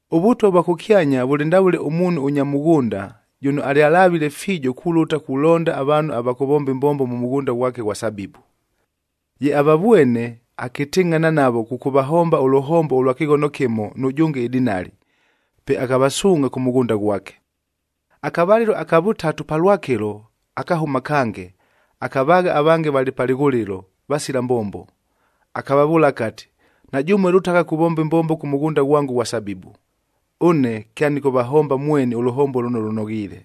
“ɄVʉtwa vwa kʉkyanya vʉlɨ ndavʉle ʉmuunhu ʉnya mʉghʉnda, jʉno alyalavile fiijo kulʉta kulonda avaanhu ava kʉvomba ɨmbombo mʉ mʉghʉnda ghwake ʉghwa sabibu. Ye avavwene, akɨtɨngʼhana navo kʉkʉvahomba ʉlʉhombo ʉlwa kɨghono kɨmo nʉjʉnge ɨdinali, pe akavasuungʼha kʉ mʉghʉnda ghwake. “Akavalɨlo aka vʉtatu palwakɨlo, akahʉma kange, akavaagha avange valɨ pa lɨghʉlɨlo, vasila mbombo. Akavavʉʉla akati, ‘Na jʉmue lʉtagha kuvomba ɨmbombo kʉ mʉghʉnda ghwango ʉghwa sabibu, ʉne kyanɨkʉvahomba mweni ʉlʉhombo lʉno lʉnoghiile.’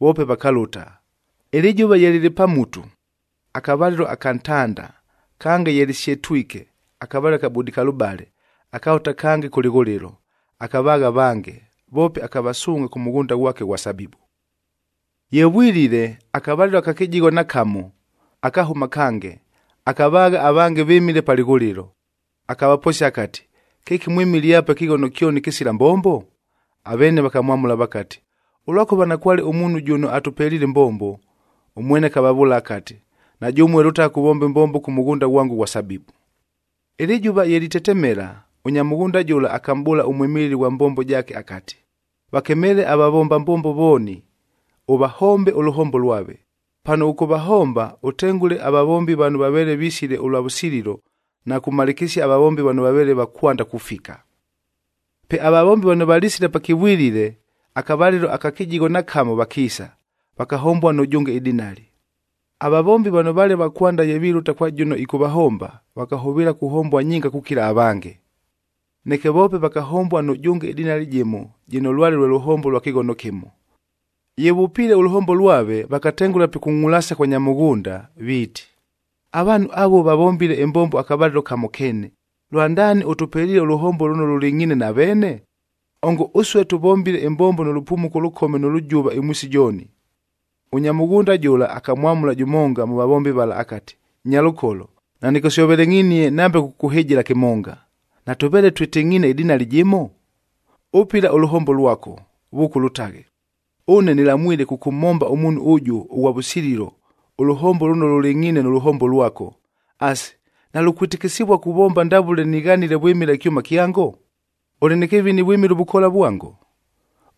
Voope vakalʉta. Ɨlɨjʉva ye lɨlɨ pa mutu, akavalɨlo aka ntanda, kange ye lɨsyetwike, akavalɨlo aka budikalʉbale, akalʉta kange kʉ lɨghʉlɨlo, akavaagha avange, voope akavasuungʼha kʉ mʉghʉnda ghwake ʉghwa sabibu. “Ye vwilile, akavalɨlo aka kɨjigho na kamo, akahʉma kange, akavaagha avange vɨmile pa lɨghʉlɨlo. Akavaposia akati, ‘Kɨki mwɨmile apa ɨkɨghono kyoni kɨsila mbombo?’ Aveene vakamwamʉla vakati, ‘Ʉlwakʉva nakwale ʉmuunhu jʉno atʉpeliile ɨmbombo.’ Ʉmwene akavavʉʉla akati, ‘Na jʉmue lʉtagha kuvomba ɨmbombo kʉ mʉghʉnda ghwango ʉghwa sabibu.’ “Ɨlɨjʉva ye litetemela, ʉnya mʉghʉnda jʉla akamʼbʉʉla ʉmwɨmɨlɨ ghwa mbombo jaake akati, ‘Vakemeele avavomba mbombo vooni, ʉvahombe ʉlʉhombo lwave. Pano ʉkʉvahomba, ʉtengʉle avavombi vano vaveele visile ʉlwa vʉsililo na kumalɨkɨsia avavombi vano vaveele va kwanda kufika.’ “Pe avavombi vano valisile pakɨvwilile, akavalɨlo aka kɨjigho na kamo vakiisa, vakahombua nʉjʉnge ɨdinali. Avavombi vano vaale va kwanda ye vilʉta kwa jʉno ɨkʉvahomba, vakahʉvɨɨla kuhombua nyinga kukila avange. Neke voope vakahombua nʉjʉnge ɨdinali jɨmo jɨno lwale lʉhombo lwa kɨghono kɨmo. Ye vʉpiile ʉlʉhombo lwave, vakatengʉla pikungʼulasia kwa nya mʉghʉnda, viiti, ‘Avaanhu avuo vavombile ɨmbombo akavalɨlo kamo keene, lwandaani ʉtʉpeliile ʉlʉhombo lʉno lʉlɨngʼhiine na veene? Ongo ʉsue tʉvombile ɨmbombo nʉ lʉpumuko ʉlʉkome nʉ lʉjʉva ɨmwisi jooni.’ “Ʉnya mʉghʉnda jʉla akamwamʉla jʉmonga mʉ vavombi vala akati, ‘Nyalʉkolo, nanɨkʉsyovelengʼhinie nambe kʉkʉkʉhɨjɨla kɨmonga. Natʉveele twɨtɨngʼhiine ɨdinali jɨmo? Ʉpɨla ʉlʉhombo lwako, vʉʉka ʉlʉtaghe! Ʉne nɨlamwile kʉkʉmhomba ʉmuunhu ʉjʉ ʉghwa vʉsililo ʉlʉhombo lʉno lʉlɨngʼhiine nʉ lʉhombo lwako. Asi, nalukwɨtɨkɨsɨvua kuvomba ndavʉle nighanile vwɨmɨla ɨkyʉma kyango? Ʉlɨ nɨ kɨvini vwɨmɨla ʉvʉkoola vwango?’”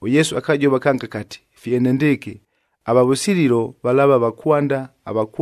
ɄYesu akajova kange akati, “Fye enendɨɨkɨ, ava vʉsililo valaava va kwanda,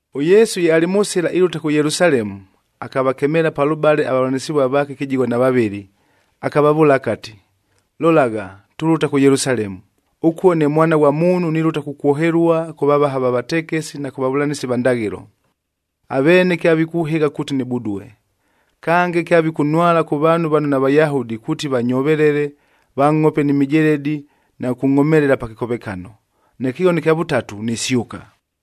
ɄYesu ye alɨ mʉ sɨla ilʉta kʉ Yelusalemu, akavakemeela palʉbale avavʉlanɨsɨvua vaake kɨjigho na vavɨlɨ, akavavʉʉla akati, “Lolagha, tulʉta kʉ Yelusalemu, ʉkuo ne Mwana ghwa Muunhu nilʉta kukwohelua kʉ vavaha va vatekesi na kʉ vavʉlanɨsi va ndaghɨlo. Aveene kyavikʉhɨgha kuuti nɨbudue. Kange, kyavikʉnhwala kʉ vaanhu vano naVayahudi kuuti vanyovelele, vangʼhope ni mijeledi na kʉkʉngʼhomelela pa kɨkovekano. Neke ɨkɨghono ɨkya vʉtatu, nisyʉka.”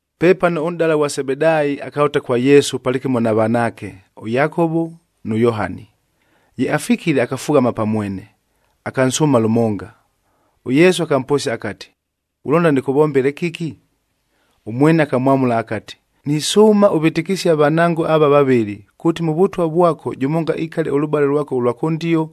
Pepano ʉnʼdala ghwa Sebedaayi akalʉta kwa Yesu palɨkɨmo na vanaake, ʉYakovo nʉ Yohani. Ye afikile akafughama pa mwene, akansʉʉma lʉmonga. ɄYesu akamposia akati, “Ghulonda nɨkʉvombele kɨki?” Ʉmwene akamwamʉla akati, “Nisʉʉma ʉvɨtɨkɨsie avanango ava vavɨlɨ, kuuti mʉ Vʉtwa vwako jʉmonga ikale ʉlʉbale lwako ʉlwa kʉndio,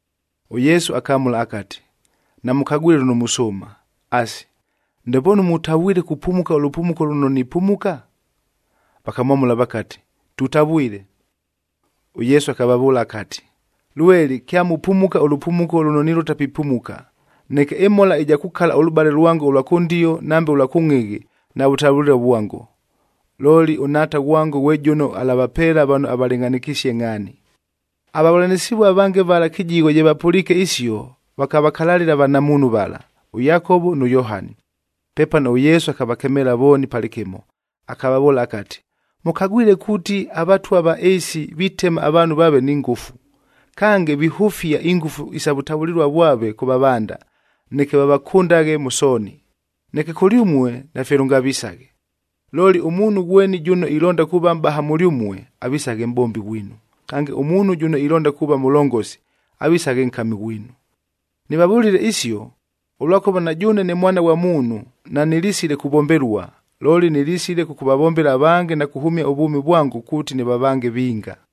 ɄYesu akamʉla akati, “Namʉkagwile lʉno musʉʉma. Asi, ndepoonu mutavwile kupumuka ʉlʉpumuko lʉno nipumuka?”c Vakamwamʉla vakati, “Tutavwile!” ɄYesu akavavʉʉla akati, “Lweli kyamupumuka ʉlʉpumuko lʉno nilʉta pipumuka, neke ɨmhola ja kukala ʉlʉbale lwango ʉlwa kʉndio nambe ʉlwa kʉngʼhɨghɨ navʉtavʉlɨlua vwango. Looli ʉNhaata ghwango ghwe jʉno alavapeela vano avalɨngʼhanɨkisie ngʼhaani.” Avavʉlanɨsɨvua avange vala kɨjigho ye vapʉliike isio, vakavakalalɨla avanamuunhu vala, ʉYakovo nʉ Yohani. Pepano ʉYesu akavakemeela vooni palɨkɨmo, akavavʉʉla akati, “Mʉkagwile kuuti avatwa va ɨɨsi vitema avaanhu vaave ni ngʉfu. Kange, vihʉfia ingʉfu isa vʉtavʉlɨlua vwave kʉ vavanda, neke vavakʉndaghe mʉ sooni. Neke kʉlyʉmue nafye lʉngavisaghe. Looli ʉmuunhu ghweni jʉno ilonda kuuva mʼbaha mʉlyʉmue, avisaghe mʼbombi ghwinu. Kange, ʉmuunhu jʉno ilonda kuuva mʉlongosi, avisaghe nkamid ghwinu. Nɨvavʉlile isio, ʉlwakʉva na jʉʉne ne Mwana ghwa Muunhu nanɨlisile kuvombelua, looli nɨlisile kʉkʉvavombela avange na kuhʉmia ʉvwʉmi vwango kuuti nɨvavange vinga.”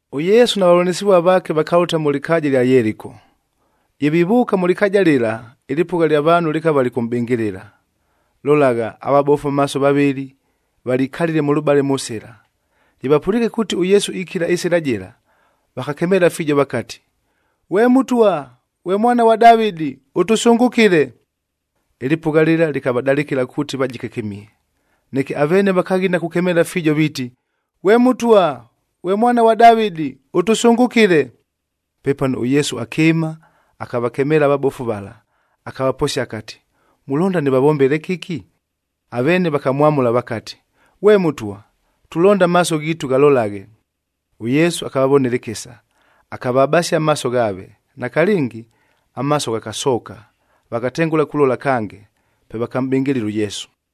ɄYesu na vavʉlanɨsɨvua vaake vakalʉta mʉ lɨkaaja ɨlya Yeliko. Ye vivʉʉka mʉ lɨkaaja lɨla, ɨlɨpʉgha ɨlya vaanhu lɨkava lɨkʉmʼbɨngɨlɨla. Lolagha, avabofu amaaso vavɨlɨ valikalile mʉlʉbale mʉ sɨla, ye vapʉliike kuuti ʉYesu ikila ɨsɨla jɨla, vakakemeela fiijo vakati, “Ghwe Mʉtwa, ghwe Mwana ghwa Davɨdi, ʉtʉsʉngʉkɨle!” Ɨlɨpʉgha lɨla lɨkavadalɨkɨla kuuti vajike kɨmihe, neke aveene vakaghina kukemeela fiijo, viiti, “Ghwe Mʉtwa, Mwana ghwa Davɨdi, ʉtʉsʉngʉkɨle!” Pepano ʉYesu akɨɨma, akavakemeela avabofu vala, akavaposia akati, “Mulonda nɨvavombele kɨki?” Aveene vakamwamʉla vakati, “Ghwe Mʉtwa, tulonda amaaso ghiitu, ghalolaghe!” ɄYesu akavavonela ɨkɨsa, akavabasia amaaso ghaave. Nakalɨngi, amaaso ghakasooka, vakatengʉla kulola kange, pe vakamʼbɨngɨlɨla ʉYesu.